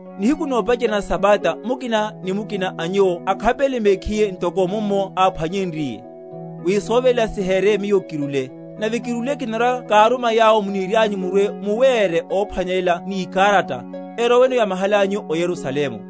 Nihiku nopacherya na sabata mukina ni mukina a nyuwo akhapelele mekhiye, ntoko mummo áphwanyenryiye, wi soveléla sihereye miyo kirúle. Nave kirúle, kinarwa‐káruma yawo munirianyu murwe‐muwere óphwanelela ni ikarata, eroweno yamahalányu o Yerusalemu.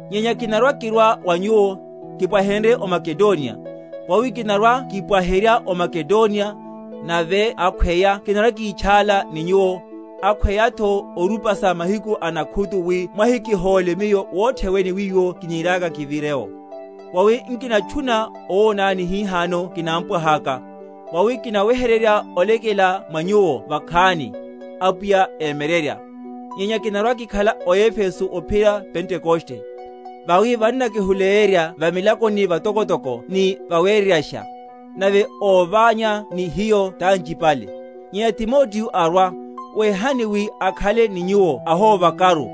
Nyenya kinarwa‐kirwa wa nyuwo, kipwahenrye o Makedoniya; vawi kinarwa‐kipwaherya o Makedoniya; nave akhweya kinarwa‐kítchála ni nyuwo, akhweyatho orupasa mahiku a nakhutu wi mwahikihóle miyo wothe wene wiwo kiniriaka kivire’wo. Vawi nkinatchuna owonani hihano kinámpwahaka; vawi kinaweheryerya olekela mwa nyuwo vakhani, Apwiya émyeryerya. Nyenya kinarwa‐kikhala o Efeso ophiyerya Pentekoste. Vawi vannakihuleyerya va milakoni vatokotoko ni vawereyasha, nave óványana ni hiyo tanchipale. Nyenya Timoteo arwa, wehani wi akhale ni nyuwo ahóvakaru;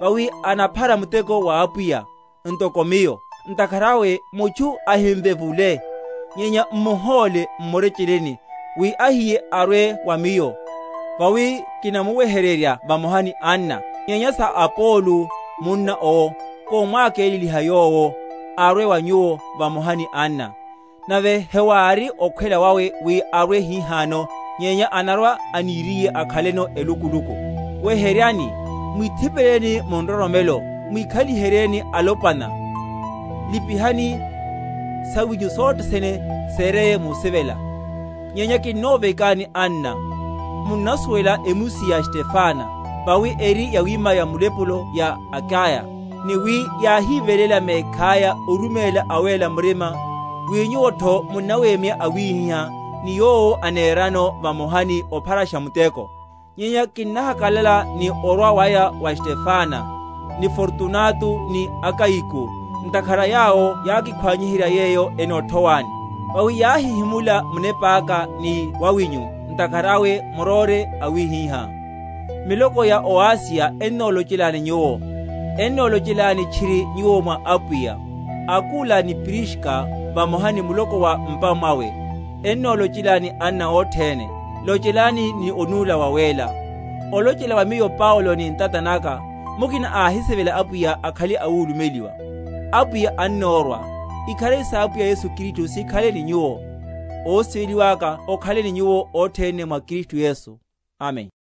vawi anaphara muteko wa Apwiya, ntokotho miyo; ntakhara awe mutchu ahimvevule. Nyenya m’muhóle m’murecheleni, wi ahiye arwe wa miyo; vawi kinamuweheryerya vamoha ni anna. Nyenya sa Apolo, munna owo, komwakeleliha yowo, arwe wa nyuwo vamoha ni anna; nave hewári okhwela wawe wi arwe hihano, nyenya anarwa aniriye akhaleno elukuluku. Weheryani, mwíthipeleni mu nroromelo, mwíkhaliheni alopwana, lipihani. Sawinyu sothe sene sereye musivela. Nyenya kinnovekani, anna, (munnasuwela emusi ya Stefana, vawi eri yawima ya mulepulo ya Akaya, ni wi yáhiveléla mekhaya oruméla awéla murima), wi nyuwotho munnawemya awihiha, ni yowo anerano vamoha, ni opharasha muteko. Nyenya kinnahakalala ni orwa waya wa Stefana, ni Fortunato, ni Akayiko; ntakhara yawo yákikhwaniherya yeyo enothowani. Vawi yáhihimula munepáka ni wawinyu; ntakhara awe muróre awihiha. Miloko ya o Asiya ennolochelani nyuwo. Ennolochelani tchiri nyuwo mwa Apwiya, Akula ni Priska, vamoha ni muloko wa m’pa mwaya. Ennolochelani anna othene. Lochelanani ni onúla wawéla. Olochela wa miyo Paulo ni ntata naka. Mukina áhisivelaka Apwiya, akhale awulumeliwa. Apwiya annorwa. Ikharari sa Apwiya Yesu Kristu sikhale ni nyuwo. Osivela waka okhale ni nyuwo othene mwa Kristu Yesu. Amen.